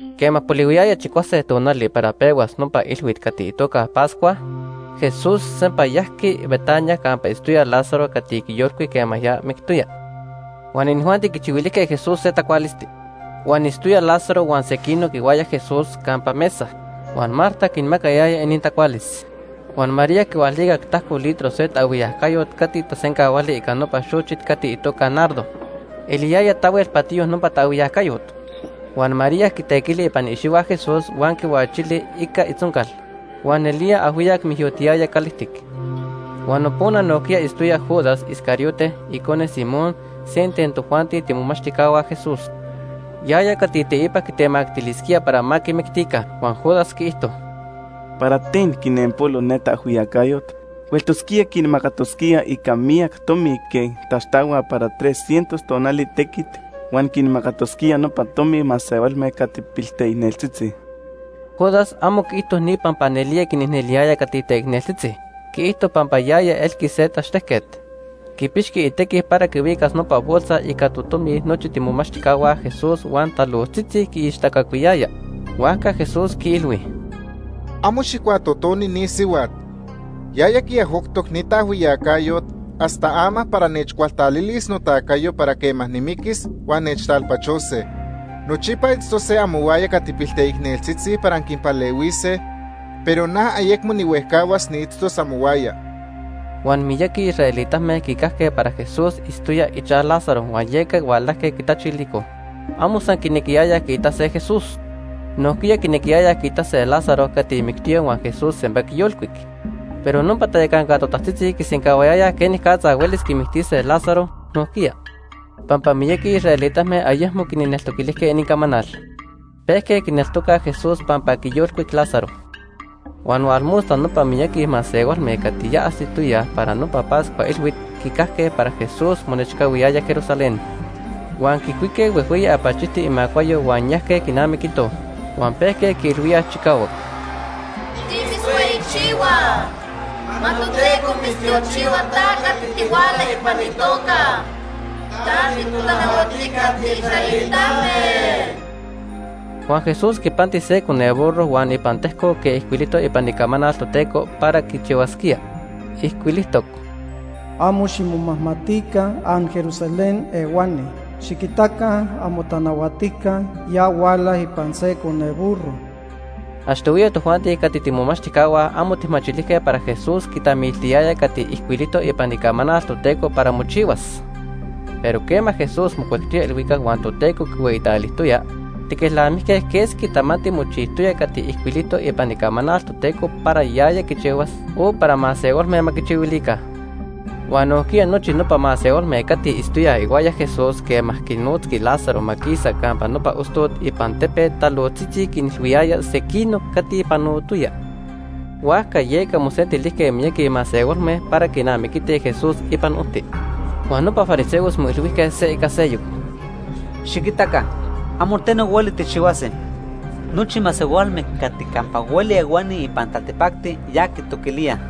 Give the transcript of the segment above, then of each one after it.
Quema polihuiyaya chicuase tonali para pehuas nopa ilhuit cati itoca Pascua, Jesús sempa yajqui Betania campa itztoya Lázaro cati quiyolcuic quema ya mictoya. Huan inijuanti quichihuilijque Jesús se tacualisti. Huan itztoyaj Lázaro huan sequinoc ihuaya Jesús campa mesa, huan Marta quinmacayaya inintacualis. Huan María quihualicac tajco litro se taajhuiyacayot cati tasencahuali ica nopa xochit cati itoca nardo. Eliyaya tahuel patiyo nopa taajhuiyacayot. Huan María quitequili ipan iicxihua Jesús huan quihuachili ica itzoncal. Huan nelía ajhuiyac mijyotiyaya calijtic. Huan nopona nojquiya itztoya Judas Iscariote, icone Simón, se ten tojuanti tiimomachtijcahua Jesús. Yaya cati teipa quitemactilisquía para ma quimictica. Huan Judas quiijto: ―¿Para ten quinenpolo ne taajhuiyacayot? Hueltosquía quinamacatosquía ica miyac tomi quej taxtahuaj para tres cientos tonali tequit huan quinmacatosquía nopa tomi masehualme cati pilteicneltzitzi. Judas amo quiijto ni pampa nelía quinicneliyaya cati teicneltzitzi. Quiijto pampa yaya elqui se tachtejquet. Quipixqui itequi para quihuicas nopa bolsa ica totomi nochi tiimomachtijcahua Jesús huan talojtzitzi quiichtacacuiyaya. Huajca Jesús quiilhui: ―Amo xijcuatotoni ni sihuat. Yaya quiajoctoc ni taajhuiyacayot hasta ama para nechcualtalilis notacayo para quema nimiquis huan nechtalpachose. Nochipa itztose amohuaya cati pilteicneltzitzi para anquinpalehuise, pero na ayecmo nihuejcahuas niitztos amohuaya. Huan miyaqui israelitame quicajque para Jesús itztoya ichaj Lázaro huan yeca hualajque quitachilicoj. Amo san quinequiyayaj quiitase Jesús. Nojquiya quinequiyayaj quiitase Lázaro cati mictoya huan Jesús sempa quiyolcuic. Pero nopa tayacanca totajtzitzi quisencahuayayaj quenicatza huelis quimictise Lázaro nojquiya, pampa miyaqui israelitame ayecmo quinneltoquilijque inincamanal. Pejque quineltocaj Jesús pampa quiyolcuic Lázaro. Huan hualmosta nopa miyaqui masehualme cati ya ajsitoyaj para nopa Pascua Ilhuit quicajque para Jesús monechcahuiyaya Jerusalén. Huan quicuique huejhueyi apachijti imacuayo huan yajque quinamiquitoj. Huan pejque quiilhuíaj chicahuac: “¡Timitzhueyichihuaj! ¡Ma Toteco mitztiochihua ta cati tihuala ipan itoca Ica itequiticayo.! ¡Ta titotanahuatijca tiisraelitame!” Huan Jesús quipanti se coneburro huan ipan tejcoc quej ijcuilijtoc ipan Icamanal Toteco para quichihuasquía. Ijcuilijtoc: “Amo ximomajmatica anJerusalén ehuani. Xiquitaca amotanahuatijca ya huala ipan se coneburro.” Achtohuiya tojuanti cati tiimomachtijcahua amo tijmachilijque para Jesús quitamiltiyaya cati ijcuilijtoc ipan Icamanal Toteco para mochihuas, pero quema Jesús mocuectoya ilhuicac huan Toteco quihueyitalijtoya, tiquelnamijque quesqui tamanti mochijtoya cati ijcuilijtoc ipan Icamanal Toteco para yaya quichihuas o para masehualme ma quichihuilica. Huan nojquiya nochi nopa masehualme cati itztoyaj ihuaya Jesús quema quinotzqui Lázaro ma quisa campa nopa ostot ipan tepet talojtzitzi quinilhuiyayaj sequinoc cati panotoya. Huajca yeca mosentilijque miyaqui masehualme para quinamiquitij Jesús ipan ojti. Huan nopa fariseos moilhuijque se ica seyoc: ―Xiquitaca, amo teno hueli tijchihuase. Nochi masehualme cati campa hueli ehuani ipan taltipacti ya quitoquilíaj.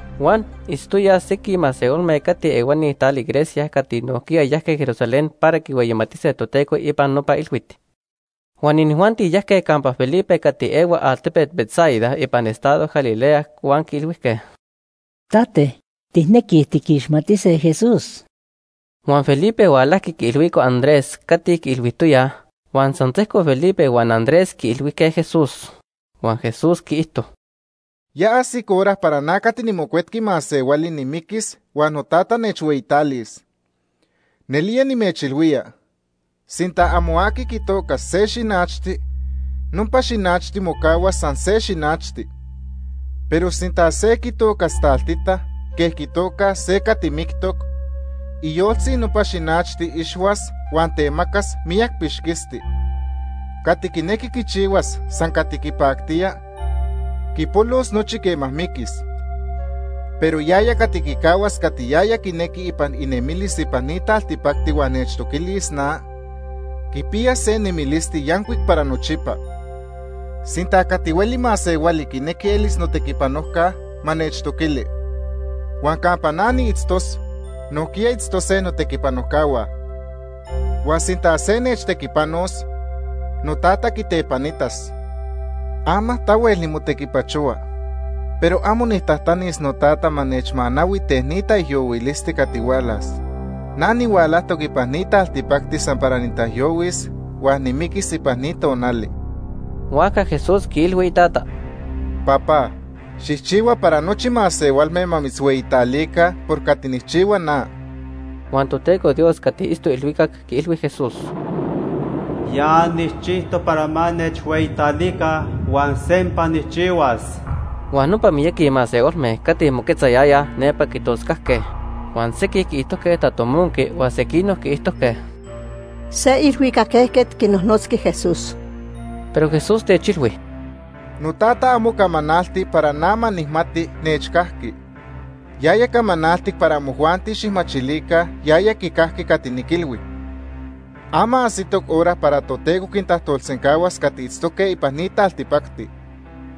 Huan itztoyaj sequij masehualme cati ehuani tali Grecia cati nojquiya yajque Jerusalén para quihueyimatise Toteco ipan nopa ilhuit. Huan inijuanti yajque campa Felipe cati ehua altepet Betsaida ipan estado Galilea huan quiilhuijque: ―Tate, tijnequij tiquixmatise Jesús. Huan Felipe hualajqui quiilhuico Andrés cati quiilhuijtoyaj, huan san sejco Felipe huan Andrés quiilhuijque Jesús. Huan Jesús quiijto: ―Ya ajsic hora para na cati niMocuetqui Masehuali nimiquis huan noTata nechhueyitalis. Nelía nimechilhuía, sinta amo aqui quitocas se xinachti, nopa xinachti mocahuas san se xinachti. Pero sinta se quitocas taltita quej quitocaj se cati mictoc, iyoltzi nopa xinachti ixhuas huan temacas miyac pixquisti. Cati quinequi quichihuas san cati quipactía, quipolos nochi quema miquis. Pero yaya cati quicahuas cati yaya quinequi ipan inemilis ipan ni taltipacti huan nechtoquilis na, quipiyas se nemilisti yancuic para nochipa. Sinta ni griegos o cati hueli masehuali quinequij elise notequipanojcahua, ma nechtoquilica. Huan campa na niitztos, nojquiya itztose notequipanojcahua. Huan sinta se nechtequipanos, noTata quitepanitas. “Ama tahuel nimotequipachohua, pero amo nijtajtanis noTata ma nechmanahui ten ni taijyohuilisti cati hualas. Na nihualajtoc ipan ni taltipacti san para nitaijyohuis huan nimiquis ipan ni tonali.” Huajca Jesús quiilhui iTata: ―Papá, xijchihua para nochi masehualme ma mitzhueyitalica Ma quihueyitalica motoca. por cati nijchihua na. Huan Toteco Dios cati itztoc ilhuicac quiilhui Jesús: ―Ya nijchijtoc para ma nechhueyitalica huan sempa nijchihuas. Huan nopa miyaqui masehualme cati moquetzayayaj nepa quitoscajque, huan sequij quiijtojque tatomonqui huan sequinoc quiijtojque: ―Se ilhuicac ejquet quinojnotzqui Jesús. Pero Jesús techilhui: ―NoTata amo camanalti para na ma nijmati nechcajqui. Yaya camanaltic para amojuanti xijmachilica yaya quicajqui cati niquilhui. Ama ajsitoc hora para Toteco quintajtolsencahuas cati itztoque ipan ni taltipacti.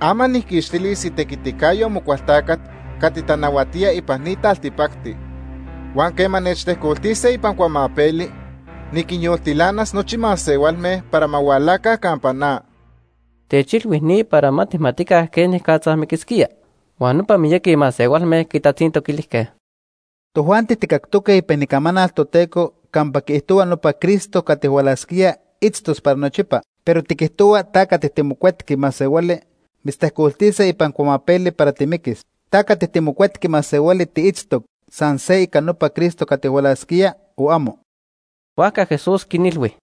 Ama nijquixtilis itequiticayo Amocualtacat cati tanahuatía ipan ni taltipacti. Huan quema nechtejcoltise ipan cuamapeli, niquinyoltilanas nochi masehualme para ma hualaca campa na. Techilhui ni para ma tijmatica quenicatza miquisquía. Huan nopa miyaqui masehualme quitatzintoquilijque: ―Tojuanti tijcactoque ipan Icamanal Toteco campa quiijtohua nopa Cristo cati hualasquía itztos para nochipa. Pero tiquijtohua ta cati tiMocuetqui Masehuali, mitztejcoltise ipan cuamapeli para timiquis. ¿Ta cati tiMocuetqui Masehuali tiitztoc san se ica nopa Cristo cati hualasquía o amo? Huajca Jesús quinilhui: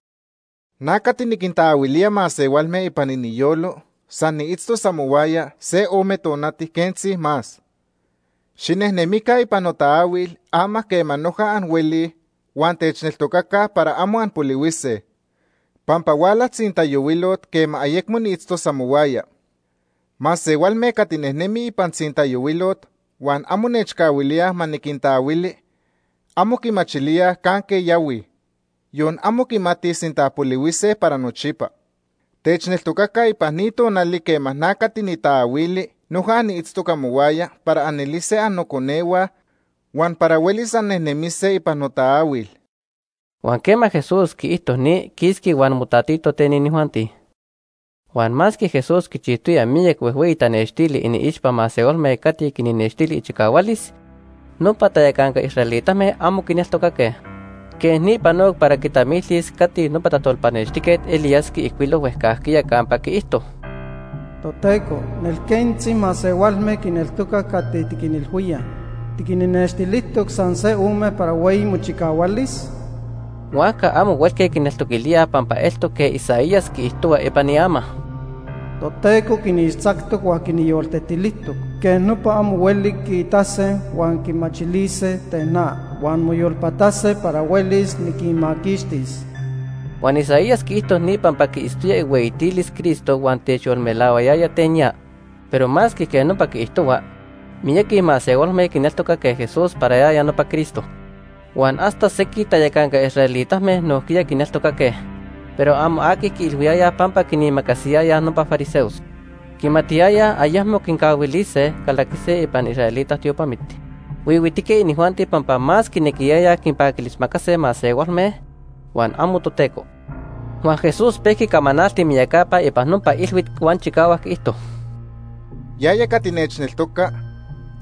―Na cati niquintaahuilía masehualme ipan iniyolo san niitztos amohuaya se ome tonati quentzi más. Xinejnemica ipan notaahuil ama quema noja anhuelij huan techneltocaca para amo anpolihuise. Pampa huala tzintayohuilot quema ayecmo niitztos amohuaya. Masehualme cati nejnemij ipan tzintayohuilot huan amo nechcahuilíaj ma niquintaahuili, amo quimachilíaj canque yahuij, yon amo quimatij sinta polihuise para nochipa. Techneltocaca ipan ni tonali quema na cati nitaahuili noja niitztoc amohuaya para anelise annoconehua huan para huelis annejnemise ipan notaahuil. Huan quema Jesús quiijto ni, quisqui huan motatito ten inijuanti. Huan masque Jesús quichijtoya miyac huejhueyi tanextili iniixpa masehualme cati quinnextili ichicahualis, nopa tayacanca israelitame amo quineltocaque. Quej ni panoc para quitamiltis cati nopa tajtolpanextijquet Elías quiijcuilo huejcajquiya campa quiijto: “Toteco, nel quentzi masehualme quineltocaj cati tiquinilhuíaj. ¿Tiquinnextilijtoc san se ome para hueyi mochicahualis?” Huajca amo huelque quineltoquilíaj pampa eltoc quej Isaías quiijtohua ipan iama: “Toteco quinixtzactoc huan quinyoltetilijtoc. Quej nopa amo hueli quiitase huan quimachilise ten na, huan moyolpatase para huelis niquinmaquixtis.” Huan Isaías quiijto ni pampa quiitztoya ihueyitilis Cristo huan techyolmelahuayaya ten ya. Pero masque quej nopa quiijtohua, miyaqui masehualme quineltocaque Jesús para yaya nopa Cristo. Huan hasta sequij tayacanca israelitame nojquiya quineltocaque, pero amo aqui quiilhuiyayaj pampa quinimacasiyayaj nopa fariseos. Quimatiyayaj ayecmo quincahuilise calaquise ipan israelita tiopamit. Huihuitique inijuanti pampa más quinequiyayaj quinpaquilismacase masehualme, huan amo Toteco. Huan Jesús pehua camanalti miyacapa ipan nopa ilhuit huan chicahuac quiijto: “Yaya cati nechneltoca,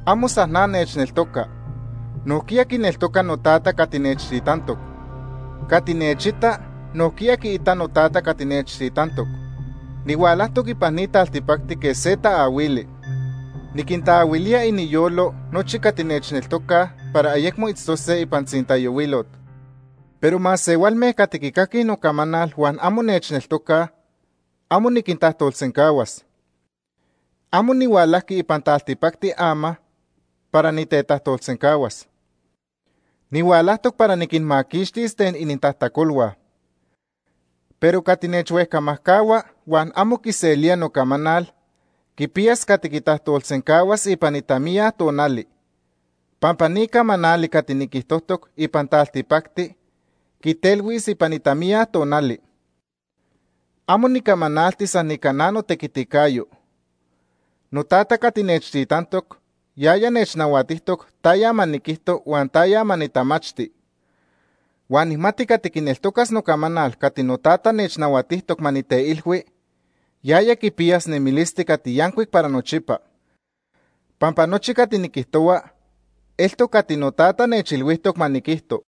amo san na nechneltoca. Nojquiya quineltoca noTata cati nechtitantoc. Cati nechita, nojquiya quiita noTata cati nechtitantoc. Nihualajtoc ipan ni taltipacti quej se taahuili. Niquintaahuilía iniyolo nochi cati nechneltocaj para ayecmo itztose ipan tzintayohuilot. Pero masehualme cati quicaquij nocamanal huan amo nechneltocaj, amo niquintajtolsencahuas. Amo nihualajqui ipan taltipacti ama para nitetajtolsencahuas. Nihualajtoc para niquinmaquixtis ten inintajtacolhua. Pero cati nechhuejcamajcahua huan amo quiselía nocamanal quipiyas cati quitajtolsencahuas ipan itamiya tonali, pampa ni camanali cati niquijtojtoc ipan taltipacti quitelhuis ipan itamiya tonali. Amo nicamanalti san ica na notequiticayo. NoTata cati nechtitantoc yaya nechnahuatijtoc taya ma niquijto huan taya ma nitamachti. Huan nijmati cati quineltocas nocamanal cati noTata nechnahuatijtoc ma niteilhui, yaya quipiyas nemilisti cati yancuic para nochipa. Pampa nochi cati niquijtohua eltoc cati noTata nechilhuijtoc ma niquijto.”